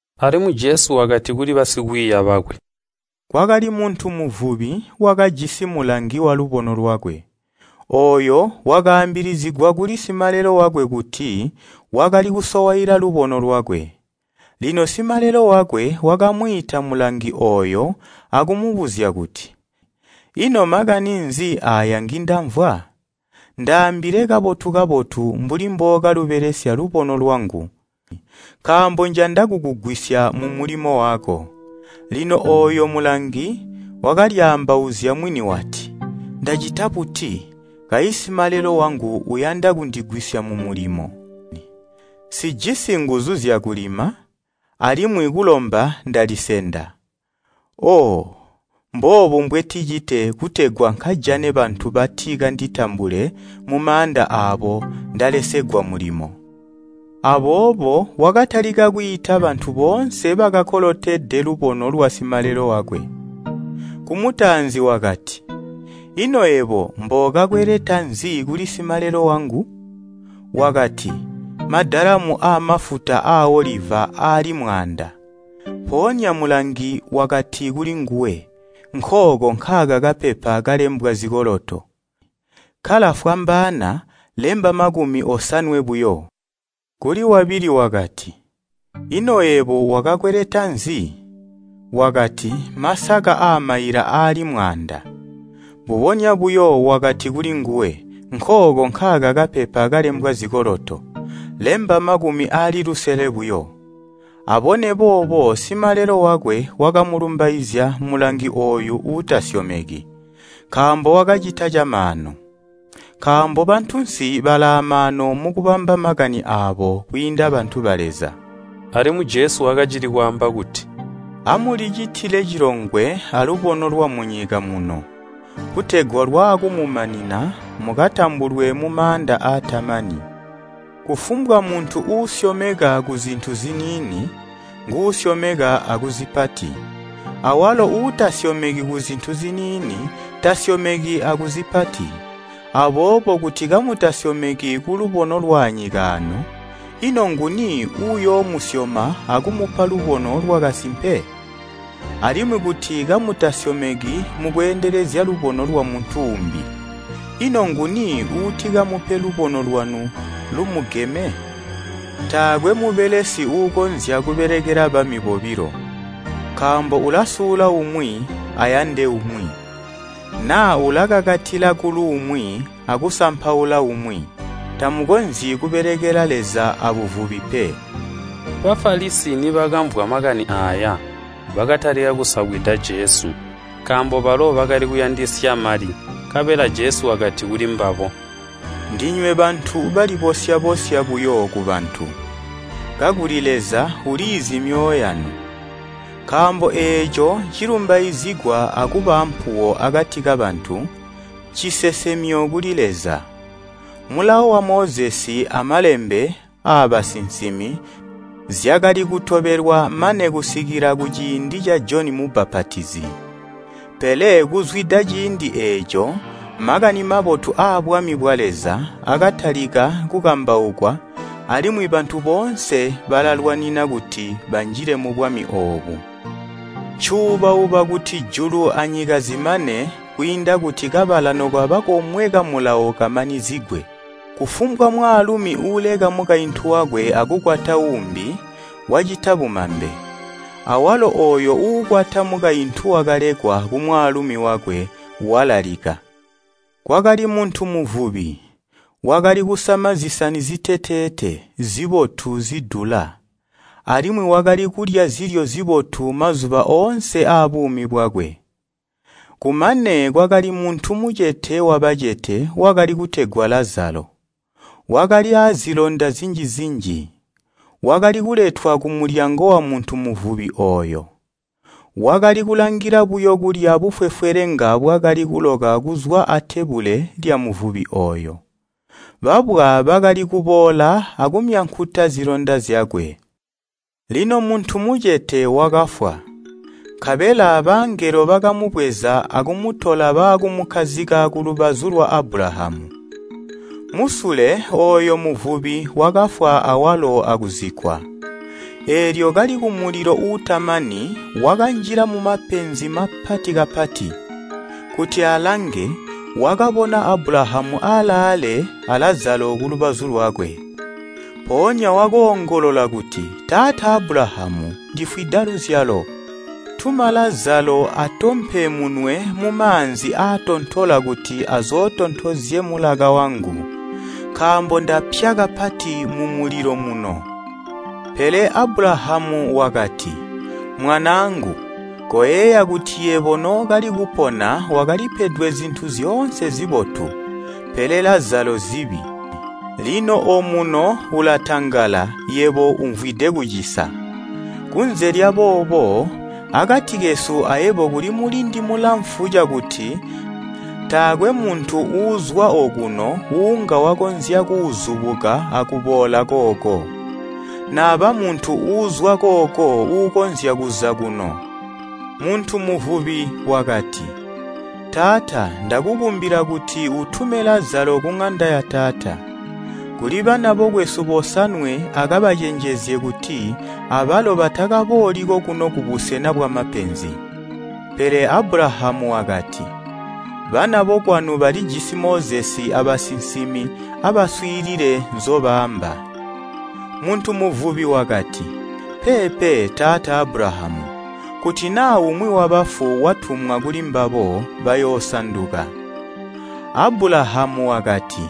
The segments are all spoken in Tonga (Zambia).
Alimwi Jesu wakati kuli basikwiiya bakwe, “Kwakali muntu muvubi, wakajisi mulangi walubono lwakwe. Ooyo wakaambilizigwa kuli simalelo wakwe kuti wakali kusowaila lubono lwakwe. Lino simalelo wakwe wakamwiita mulangi ooyo akumubuzya kuti, ‘Ino makani nzi aaya ngindamvwa? Ndaambile kabotu-kabotu mbuli mbookalubelesya lubono lwangu, nkaambo njanda kukugwisya mumulimo wako.’ Lino ooyo mulangi wakalyaambauzya mwini wati, ‘Ndacita buti, kayi simalelo wangu uyanda kundigwisya mulimo? Nsijisi nguzu zyakulima, alimwi kulomba ndalisenda. Oo! mboobu mbwenticite kutegwa nkajane bantu bati kanditambule mumaanda aabo ndalesegwa mulimo.’ Aboobo wakatalika kwiita bantu boonse bakakolotede lubono lwasimalelo wakwe. Kumutaanzi wakati, ‘Ino yebo mbookakweleta nzi kuli simalelo wangu?’ Wakati ‘Madalamu aamafuta aaoliva aali mwaanda.’ Mpoonya mulangi wakati kulinguwe, ‘Nkooko nkaaka kapepa kalembwa zikoloto. Kkala fwambaana lemba makumi osanwe buyo.’ Kuli wabili wakati, ‘Ino yebo wakakweleta nzi?’ Wakati, ‘Masaka aamaila aali mwaanda.’ Mbubonya buyo wakati kulinguwe, ‘Nkooko nkaaka kapepa kalembwa zikoloto. Lemba makkumi aali lusele buyo.’ Abone boobo simalelo wakwe wakamulumbaizya mulangi ooyu uutasyomeki, nkaambo wakacita camaanu. Nkaambo bantunsi balaamaanu mukubamba makani aabo kwiinda bantu ba Leza.” Alimwi Jesu wakacili kwaamba kuti, “Amulicitile cilongwe alubono lwamunyika muno, kutegwa lwaakumumanina mukatambulwe mumaanda aatamani. Kufumbwa muntu uusyomeka kuzintu ziniini, nguusyomeka akuzipati, awalo uutasyomeki kuzintu ziniini, tasyomeki akuzipati. Aboobo kuti kamutasyomeki kulubono lwaanyika aano, ino nguni uuyoomusyoma akumupa lubono lwakasimpe? Alimwi kuti kamutasyomeki mukweendelezya lubono lwamuntu uumbi, ino nguni uutikamupe lubono lwanu lumugeme? “Taakwe mubelesi uukonzya kubelekela bami bobilo. Nkaambo ulasula umwi ayande umwi, naa ulakakatila kuluumwi akusampaula umwi. Tamukonzyi kubelekela Leza abuvubi pe.” Bafalisi nibakamvwa makani aaya, bakatalika kusabwida Jesu, nkaambo balo bakali kuyandisya mali. Nkabela Jesu wakati kulimbabo, “Ndinywe bantu balibosya-bosya buyo kubantu, kakuli Leza uliizi myoyo yanu. Nkaambo eeco cilumbaizigwa akubaampuwo akati kabantu, ncisesemyo kuli Leza. “Mulawo wa Mozesi amalembe aabasinsimi zyakali kutobelwa mane kusikila kuciindi ca Joni Mubbapatizi, pele kuzwida ciindi eeco Makani Mabotu aabwami bwa Leza akatalika kukambaukwa, alimwi bantu boonse balalwanina kuti banjile mubwami oobu. Ncuubauba kuti julu anyika zimane kwiinda kuti kabala nokaba komwe ka Mulawo kamanizigwe. “Kufumbwa mwaalumi uuleka mukaintu wakwe akukwata uumbi, wacita bumambe, awalo ooyo uukwata mukaintu wakalekwa kumwaalumi wakwe, walalika. “Kwakali muntu muvubi, wakali kusama zisani ziteteete, zibotu zidula, alimwi wakali kulya zilyo zibotu mazuba oonse aabuumi bwakwe. Kumane kwakali muntu mucete wabacete wakali kutegwa Lazalo, wakali aazilonda zinji-zinji. Wakali kuletwa kumulyango wamuntu muvubi ooyo, wakali kulangila buyo kulya bufwefwelenga bwakali kuloka kuzwa atebule lyamuvubi ooyo. Babwa bakali kuboola akumyankuta zilonda zyakwe. “Lino muntu mucete wakafwa, nkabela bangelo bakamubweza akumutola baakumukkazika kulubazu lwa Abulahamu. Musule ooyo muvubi wakafwa awalo akuzikkwa. Eelyo kali kumulilo uutamani wakanjila mumapenzi mapati kapati. Kuti alange, wakabona Abulahamu alaale a Lazalo kulubazu lwakwe. Mpoonya wakoongolola kuti, ‘Taata Abulahamu, ndifwida luzyalo, tuma Lazalo atompe munwe mumaanzi aatontola kuti azootontozye mulaka wangu, nkaambo ndapya kapati mumulilo muno!’ “Pele Abulahamu wakati, ‘Mwanaangu, koyeeya kuti yebo nookali kupona wakalipedwe zintu zyoonse zibotu, pele Lazalo zibi. Lino omuno ulatangala yebo umvwide kucisa. Kunze lyaboobo, akati kesu ayebo kuli mulindi mulamfu cakuti taakwe muntu uuzwa ookuno uunga wakonzya kuuzubuka akuboola kooko, naba muntu uuzwa kooko uukonzya kuza kuno.’ Muntu muvubi wakati, ‘Taata, ndakukumbila kuti utume Lazalo kuŋanda yataata, kuli bana bokwesu bosanwe akabacenjezye kuti abalo batakabooli kokuno kubusena bwamapenzi.’ Pele Abulahamu wakati, ‘Bana bokwanu balijisi Mozesi abasinsimi abaswiilile nzobaamba.’ Muntu muvubi wakati, ‘Peepe, taata Abulahamu! Kuti naa umwi wabafu watumwa kulimbabo, bayoosanduka.’ Abulahamu wakati,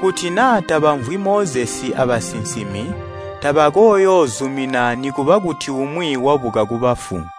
‘Kuti naa tabamvwi Mozesi abasinsimi tabakooyoozumina nikuba kuti umwi wabuka kubafu.’”